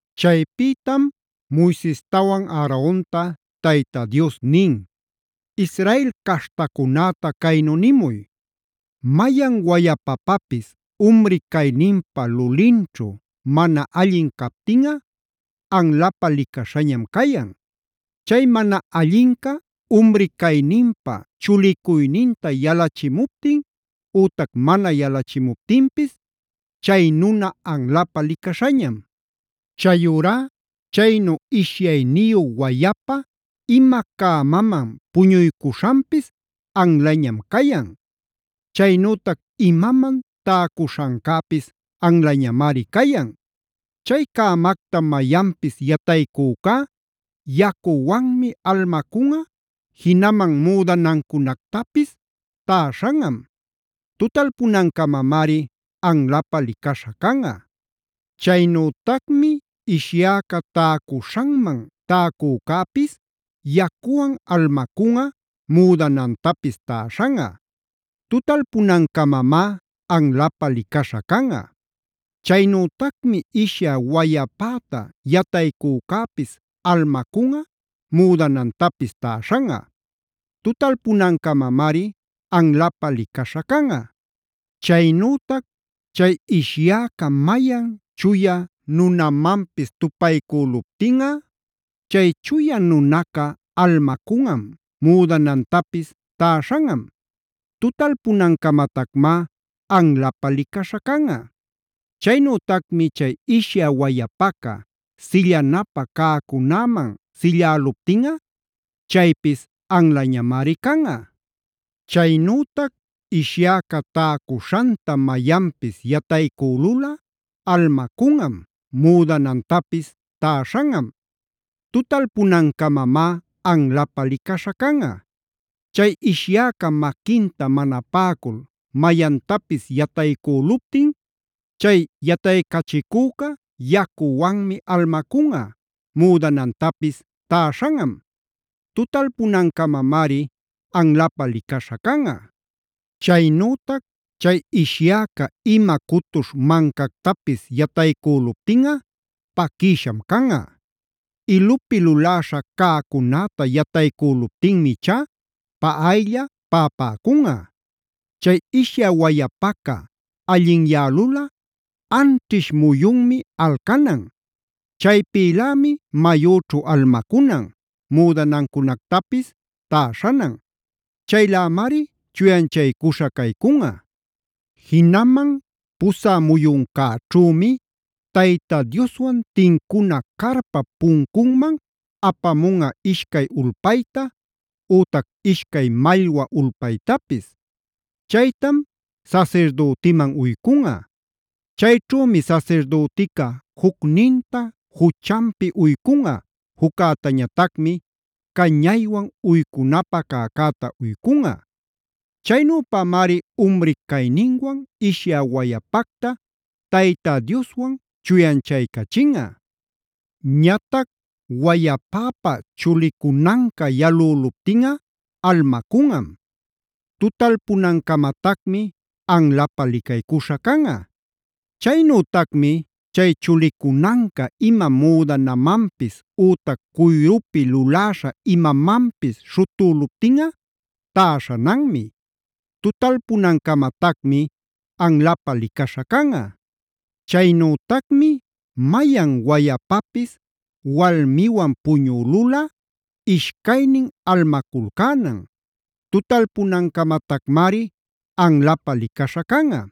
Chaypïtam Moisestawan Aaronta Tayta Dios nin: “Israel caśhtacunäta caynu nimuy: Mayan wayapapapis umri cayninpa lulinćhu mana allin captinꞌa anlapä licaśhañam cayan. Chay mana allinca umri cayninpä chulicuyninta yalachimuptin ütac mana yalachimuptinpis chay nuna anlapä licaśhañam. “Chayurá chaynu ishyayniyu wayapa ima cämaman puñuycuśhanpis anlañam cayan. Chaynütac imaman täcuśhancäpis anlañamari cayan. “Chay cämacta mayanpis yataycücá yacuwanmi almacunꞌa, jinaman müdanancunactapis täśhanꞌam. Tutalpunancamamari anlapä licaśha canꞌa. “Chaynütacmi ishyäca täcuśhanman täcücäpis yacuwan almacunꞌa, müdanantapis täśhanꞌa. Tutalpunancamamá anlapä licaśha canꞌa. “Chaynütacmi ishyä wayapäta yataycücäpis, almacunꞌa, müdanantapis täśhanꞌa. Tutalpunancamamari anlapä licaśha canꞌa. “Chaynütac chay ishyäca mayan chuya nunamanpis tuwaycüluptinꞌa, chay chuya nunaca almacunꞌam, müdanantapis täśhanꞌam. Tutalpunancamatacmá anlapä licaśha canꞌa. “Chaynütacmi chay ishyä wayapaca sillanapä cäcunäman silläluptinꞌa chaypis anlañamari canꞌa. “Chaynütac ishyäca täcuśhanta mayanpis yataycülulꞌa almacunꞌam, müdanantapis täśhanꞌam. Tutalpunancamamá anlapä licaśha canꞌa. “Chay ishyäca maquinta mana paꞌacul mayantapis yataycüluptin chay yataycachicüca yacuwanmi almacunꞌa, müdanantapis täśhanꞌam. Tutalpunancamamari anlapä licaśha canꞌa. “Chaynütac chay ishyäca ima cutuśh mancactapis yataycüluptinꞌa paquïsham canꞌa; ilupi luläśha cäcunäta yataycüluptinmi ichá paꞌaylla paꞌapäcunꞌa. “Chay ishyä wayapaca allinyälulꞌa anćhish muyunmi alcanan. Chaypïlämi mayüćhu almacunan, müdanancunactapis täśhanan. Chaylämari chuyanchaycuśha caycunꞌa. Jinaman pusä muyuncäćhümi Tayta Dioswan tincuna carpap puncunman apamunꞌa ishcay ulpayta ütac ishcay mallwa ulpaytapis. Chaytam sasirdütiman uycunꞌa. Chayćhümi sasirdütica jucninta juchanpi uycunꞌa, juccäñatacmi cañaywan uycunapä cäcäta uycunꞌa. Chaynüpamari umri cayninwan ishyä wayapacta Tayta Dioswan chuyanchaycachinꞌa. “Ñatac wayapäpa chulicunanca yalüluptinꞌa almacunꞌam; tutalpunancamatacmi anlapä licaycuśha canꞌa. “Chaynütacmi chay chulicunanca ima müdanamanpis ütac cuyrupi luläśha imamanpis śhutüluptinꞌa täśhananmi; tutalpunancamatacmi anlapä licaśha canꞌa. “Chaynütacmi mayan wayapapis walmiwan puñülulꞌa ishcaynin almaculcänan; tutalpunancamatacmari anlapä licaśha canꞌa.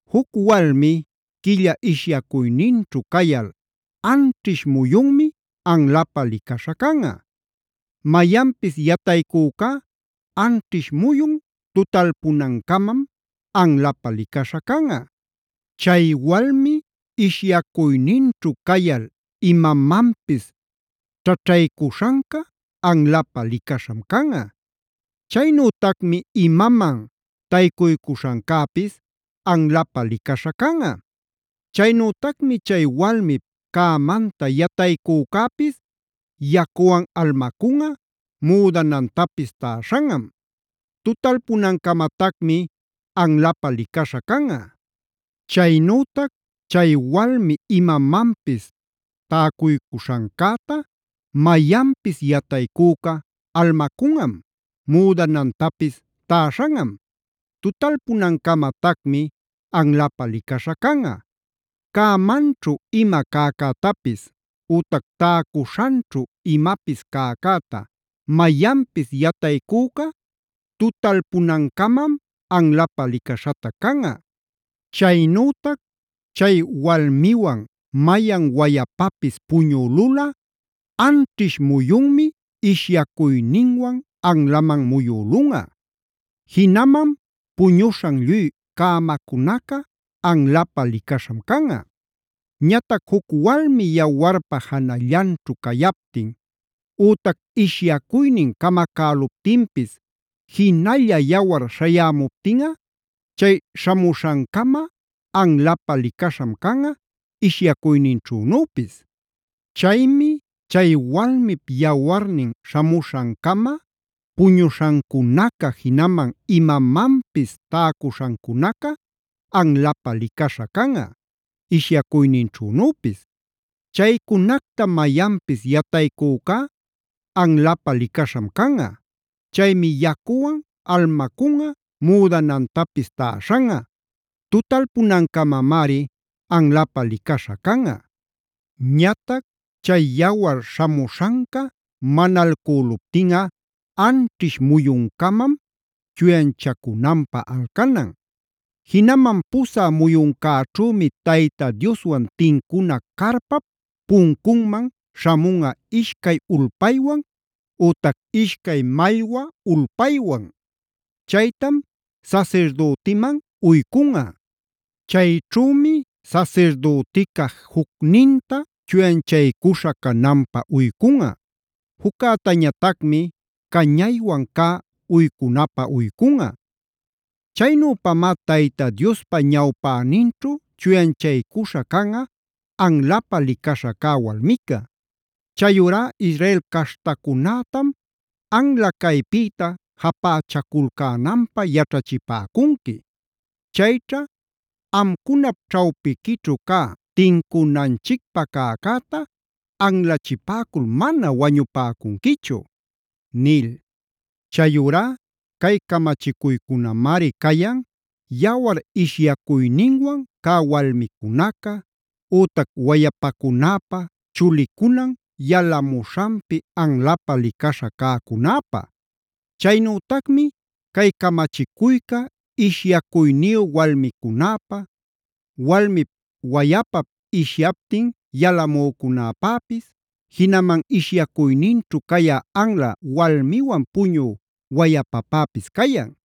“Juc walmi quilla ishyacuyninćhu cayal anćhish muyunmi anlapä licaśha canꞌa. Mayanpis yataycücá anćhish muyun tutalpunancamam anlapä licaśha canꞌa. Chay walmi ishyacuyninćhu cayal imamanpis ćhaćhaycuśhanca anlapä licaśham canꞌa. Chaynütacmi imaman taycuycuśhancäpis anlapä licaśha canꞌa. Chaynütacmi chay walmip cämanta yataycücäpis yacuwan almacunꞌa, müdanantapis täśhanꞌam; tutalpunancamatacmi anlapä licaśha canꞌa. Chaynütac chay walmi imamanpis täcuycuśhancäta mayanpis yataycüca almacunꞌam, müdanantapis täśhanꞌam; tutalpunancamatacmi anlapä licaśha canꞌa. Cämanćhu ima cäcätapis ütac täcuśhanćhu imapis cäcäta mayanpis yataycüca tutalpunancamam anlapä licaśhatac canꞌa. Chaynütac chay walmiwan mayan wayapapis puñülulꞌa anćhish muyunmi ishyacuyninwan anlaman muyülunꞌa. Jinaman puñuśhan lluy cämacunaca anlapä licaśham canꞌa. “Ñatac juc walmi yawarpa janallanćhu cayaptin ütac ishyacuynin camacäluptinpis jinalla yawar śhayämuptinꞌa chay śhamuśhancama anlapä licaśham canꞌa, ishyacuyninćhunüpis. Chaymi chay walmip yawarnin śhamuśhancama puñuśhancunaca, jinaman imamanpis täcuśhancunaca anlapä licaśha canꞌa, ishyacuyninćhünüpis. Chaycunacta mayanpis yataycücá anlapä licaśham canꞌa; chaymi yacuwan almacunꞌa, müdanantapis täśhanꞌa; tutalpunancamamari anlapä licaśha canꞌa. “Ñatac chay yawar śhamuśhanca manalcüluptinꞌa anćhish muyuncamam chuyanchacunanpä alcanan. Jinaman pusä muyuncäćhümi Tayta Dioswan tincuna carpap puncunman śhamunꞌa ishcay ulpaywan ütac ishcay mallwa ulpaywan; chaytam sasirdütiman uycunꞌa. Chayćhümi sasirdütica jucninta chuyanchaycuśha cananpä uycunꞌa, juccäñatacmi cañaywan cä uycunapä uycunꞌa. Chaynüpamá Tayta Diospa ñawpäninćhu chuyanchaycuśha canꞌa anlapä licaśha cä walmica. “Chayurá Israel caśhtacunätam anla caypïta japächaculcänanpä yaćhachipäcunqui. Chayćha amcunap ćhawpiquićhu cä tincunanchicpä cäcäta anlachipäcul mana wañupäcunquichu” nil. Chayurá cay camachicuycunamari cayan yawar ishyacuyninwan cä walmicunaca, ütac wayapacunäpä chulicunan yalamuśhanpi anlapä licaśha cäcunäpä. Chaynütacmi cay camachicuyca ishyacuyniyu walmicunäpä, walmip wayapap ishyaptin yalamücunäpäpis, jinaman ishyacuyninćhu cayä anla walmiwan puñü wayapapäpis cayan.